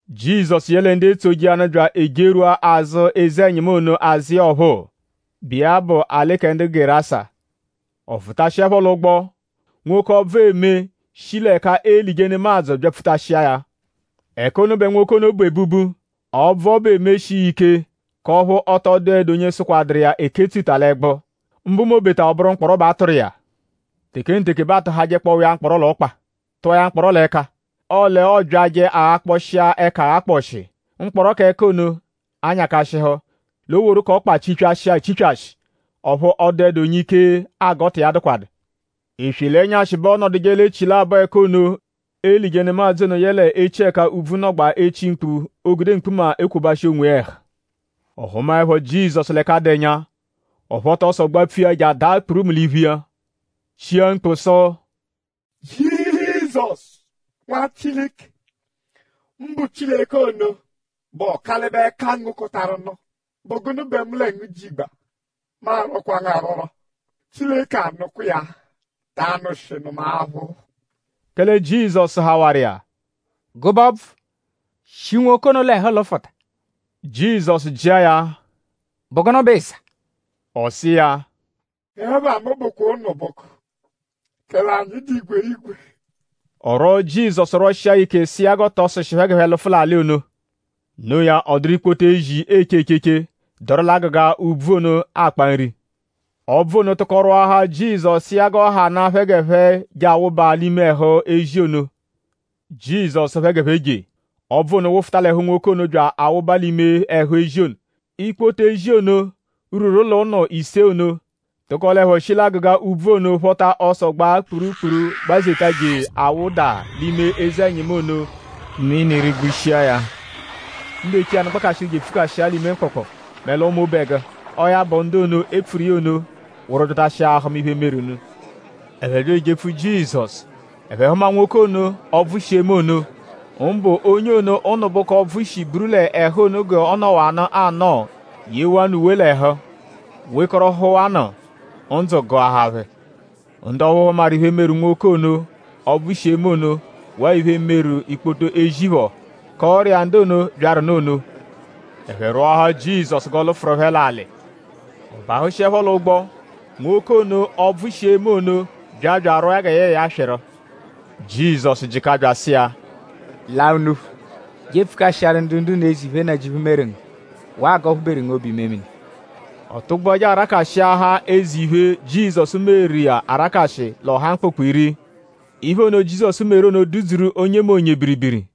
Jizọsu yẹle ndu etsoje iya nụ bya ejerwua azụ eze-ẹnyimu ono azụ iya ọphuu, bụ iya bụ l'alị kẹ ndu Gerasa. Ọ fụtashiepho l'ụgbo; nwoke, ọbvu eme shi l'ẹka eelije nemadzụ byapfutashia ya. Ẹka ono bẹ nwoke ono bu ebubu. Ọbvu ọbu emeshi iya ike; k'ọphu ọ tọ dụedu onye sụkwaduru iya eketsuta l'ẹgbu; mbụ m'obeta ọ bụru mkpọro bẹ a tụru iya. Tekenteke kpọo bẹ aatụjehawa iya mkpọro l'ọkpa; tụa ya mkpọro l'ẹka; ọle ọobyaje aghakpọshia ẹka aghakpọshi; mkpọro k'ẹka ono anyakashịhu. L'o woru k'ọkpa chipyashia echipyashi. Ọphu ọ dụedu onye ike agọta iya dụkwadu. Eswe l'ẹnyashi bẹ ọonoduje l'echilabọ ẹka ono, eelije nemadzụ ono yẹle echi ẹka úbvú nọgbaa echi mkpu; oogude mkpuma ekwobashị onwiya ẹhu. Ọ hụmaepho Jizọsu l'ẹka dụ ẹnya; ọ phọta ọso gbapfu iya je adaa kpurumu l'iphu iya; chia mkpu sụ: “Jizọsu; Nwa Chileke; mbụ Chileke ono, bụ Ọkalibe-kangokọtaru-nụ!?Bụ gụnu bẹ mu lẹ ngu jigba? Mu arwọkwa ngu arwọrwo; Chileke anụkwa iya-a; ta anụshinu mu aphụ.” Kẹle Jizọsu sụhawaru iya: “Gụbe ọbvu; shi nwoke ono l'ẹhu lụfuta!” Jizọsu jịa ya: “?Bụ gụnu bẹ ịiza?” Ọ sụ iya: “Ẹpha mu bụ ‘Ụnubuku’; kẹle anyi dụ igwerigwe.” Ọ rwọo Jizọsu rwọshia ya ike sụ iya g'ọ tọ sụshi phẹ g'ẹphe lụfu l'alị ono. Noo ya; ọ dụru ikpoto ezi, eeche echeche, dọru l'agụga úbvú ono akpa nri. Ọbvu ono tụko rwọahaa Jizọsu sụ iya g'ọ hanaa phẹ g'ẹphe je awụba l'ime ẹhu ezi ono. Jizọsu sụ phẹ g'ẹphe je. Ọbvu ono wụfuta l'ẹhu nwoke ono bya awụba l'ime ẹhu ezi ono. Ikpoto ezi ono, rwuru l'ụnu ise ono tụkolepho shi l'agụga úbvú ono phọta ọso gbaa kpurukpuru gbazeta je awụda l'ime eze-ẹnyimu ono; mini rigbushia ya. Ndu eche iya nụ gbakashịhu je epfukashia ya l'ime mkpụkpu mẹ l'ọma obẹgu. Ọo ya bụ; ndu ono, e pfuru iya ono wụru byatashia ahụma iphe, meru nụ. Ẹphe bya ejepfu Jizọsu. Ẹphe hụma nwoke ono, ọbvu shi eme ono; mbụ onye ono ụnubuku ọbvu shi buru l'ẹhu ono g'ọ nọwanu anọo; yewanụ uwe l'ẹhu; wekọrohuwanu. Ndzụ gụahaa phẹ. Ndu ọphu hụmaru iphe, meru nwoke ono, ọbvu shi eme ono; waa iphe, meru ikpoto ezi phọ; kọoru iya ndu ono, byaru nụ ono. Ẹphe rwọahaa Jizọsu g'ọ lụfuru phẹ l'alị. Ọ bahụshiepho l'ụgbo; nwoke ono, ọbvu shi eme ono bya bya arwọo ya gẹ yẹe ya swịru. Jizọsu jịka bya asụ iya: “Laa unuphu; je epfukashịaru ndu ndu-unu eze iphe, Nnajịuphu meru ngu; waa g'ọ phụ-beru ngu obu-imemini.” Ọ tụgbua je arakashịahaa eze iphe, Jizọsu meru iya arakashị l'ọha Mkpụkpu-Iri. Iphe ono, Jizọsu meru ono dudzuru onyemonye biribiri.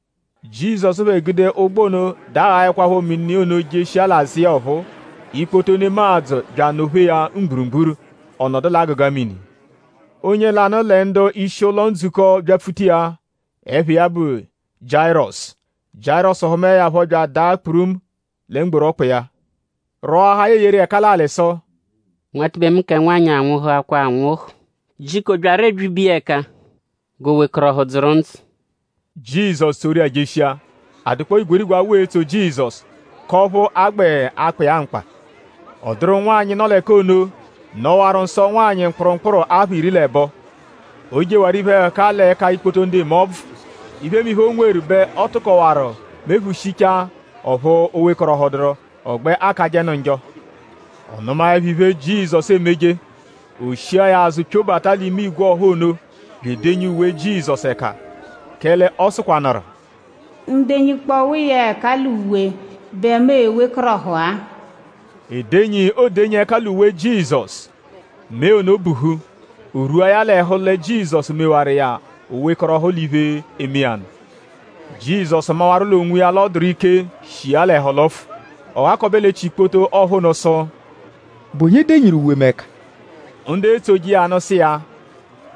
Jizọsu phẹ gude ụgbo ono daghaẹkwapho mini ono jeshia l'azụ iya ọphuu; ikpoto nemadzụ bya anọ-phee ya mgburugburu. Ọ nọdu l'agụga mini. Onye lanụ lẹ ndu-ishi ụlo-ndzukọ byapfuta iya. Ẹpha iya bụ Jiayirọsu. Jiayirọsu hụmae ya phọ bya adaa kpurumu lẹ mgboru ọkpa iya; rwọahaa ya eyeru iya ẹka l'alị sụ: “Nwatibe mu kẹ nwanyị anwụhukwa anwụhu. Jiko byarọ ebyibe iya ẹka g'o wekọrohu dzụru ndzụ.” Jizọsu tsoru iya jeshia. A dụkpoo igwerigwe awụ etso Jizọsu; k'ọphu a gbẹ akpa iya mkpa. Ọ dụru nwanyị, nọ l'ẹka ono, nọwaru nsọ-ụnwanyi mkpụrumkpuru apha iri l'ẹbo. O jewaru iphe-ẹhuka l'ẹka ikpoto ndu eme ọbvu. Iphemiphe, o nweru bẹ ọ tụkowaru mephushichaa; ọphu o wekọrohuduru; ọ gbẹ akajẹnu njọ. Ọ nụmaepho iphe, Jizọsu emeje; o shia ya azụ pyobata l'ime ìgwè ọha ono bya edenyi uwe Jizọsu ẹka. Kẹle ọ sụkwanuru: “Mu -denyikpọwa iya ẹka l'uwe bẹ mu e-wekọrohu-a.” Edenyi, oodenyi ẹka l'uwe Jizọsu; mee ono buhu. O rwua ya l'ẹhu lẹ Jizọsu mewaru iya o wekọrohu l'iphe, eme iya nụ. Jizọsu mawaru l'onwiya l'ọ dụru ike, shi iya l'ẹhu lụfu. Ọ ghakọbe l'echi ikpoto ọha ono sụ: “?Bụ onye denyiru uwe mu ẹka?” Ndu etsoje iya nụ sụ iya: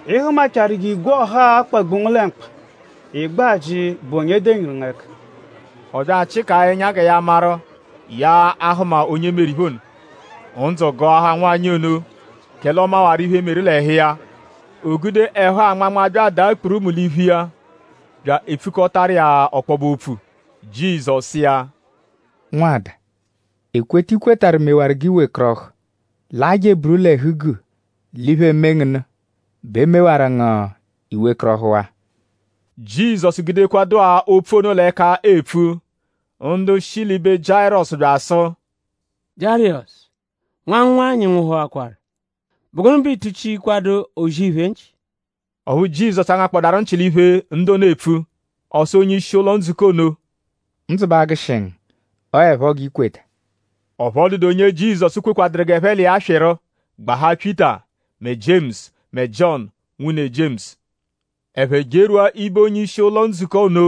“Ị hụmachaaru g'igwe ọha-a akpagbu ngu lẹ mkpa; ị gbẹ ajị: ‘?Bụ onye denyiru ngu ẹka?’” Ọ bya achịkaa ẹnya gẹ ya maru:?ya a-hụma onye meru iphe ono. Ndzụ gụahaa nwanyị ono; kẹle ọ mawaru iphe, meru l'ẹhu iya. O gude ẹhu-anmanma bya adaa kpurumu l'iphu iya; bya epfukọtaru iya ọkpobe-opfu. Jizọsu sụ iya: “Nwada; ekweta, i kwetarụ mewaru g'i wekọrohu. Laa je eburu l'ẹhu-guu l'iphe, eme ngu nụ bẹ e mewaru ngu i wekọrohuwaa.” Jizọsu gudekwadụ-a opfu ono l'ẹka epfu; ndu shi l'ibe Jiayirọsu bya bya asụ: “Jiayirọsu; nwa ngu nwanyị nwụhuakwaru.?Bụ gụnu bẹ iituchikwadu O-zì-iphe nchị?” Ọphu Jizọsu angakpọdaru nchị l'iphe, ndu ono epfu. Ọ sụ onye-ishi ụlo-ndzukọ ono: “Ndzụ ba agụshi ngu. Ọo 'ẹpho g'i kweta.” Ọphu ọ dụdu onye Jizọsu kwekwaduru g'ẹphe l'iya swịru; gbahaa Pyịta mẹ Jiemusu mẹ Jiọnu, nwune Jiemusu. Ẹphe jerwua ibe onye-ishi ụlo-ndzukọ ono;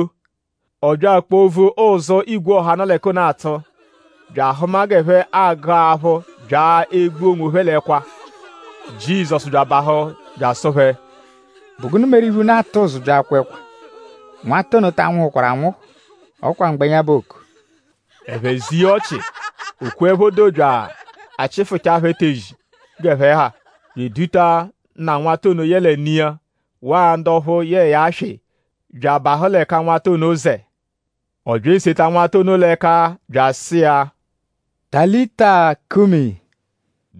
ọ bya akpovu ụzu, igwe ọha, nọ l'ẹka ono atụ; bya ahụma g'ẹphe agụ aphụ bya egbu onwophẹ l'ẹkwa. Jizọsu bya abahụ bya asụ phẹ: “?Bụ gụnu meru iphe, unu atụ ụzu bya akwa ẹkwa? Nwata ono ta nwụhukwaru anwụhu; ọ kwa mgbẹnya bẹ ooku.” Ẹphe ze iya ọchi. O kweẹpho doo bya achịfuchaa phẹ etezi g'ẹphe ha; bya eduta nna nwata ono yẹle ne iya; waa ndu ọphu yẹe ya swị bya abahụ l'ẹka nwata ono zẹ. Ọ bya eseta nwata ono l'ẹka bya asụ iya: “Talita kumi,”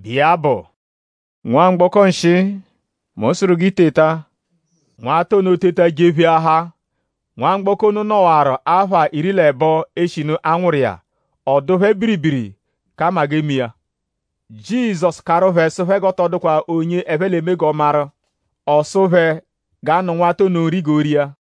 bụ iya bụ: “Nwamgbọko-nshịi; mu sụru g'i teta!” Nwata ono teta jepheahaa. Nwamgbọko ono nọwaru apha iri l'ẹbo eshinu a nwụru iya. Ọ dụ phẹ biribiri kẹ 'ama g'eme iya. Jizọsu karụ phẹ sụ phẹ g'ọ tọ dụkwa onye ẹphe l'e-me g'ọ maru. Ọ sụ phẹ g'a nụ nwata ono nri g'o ria.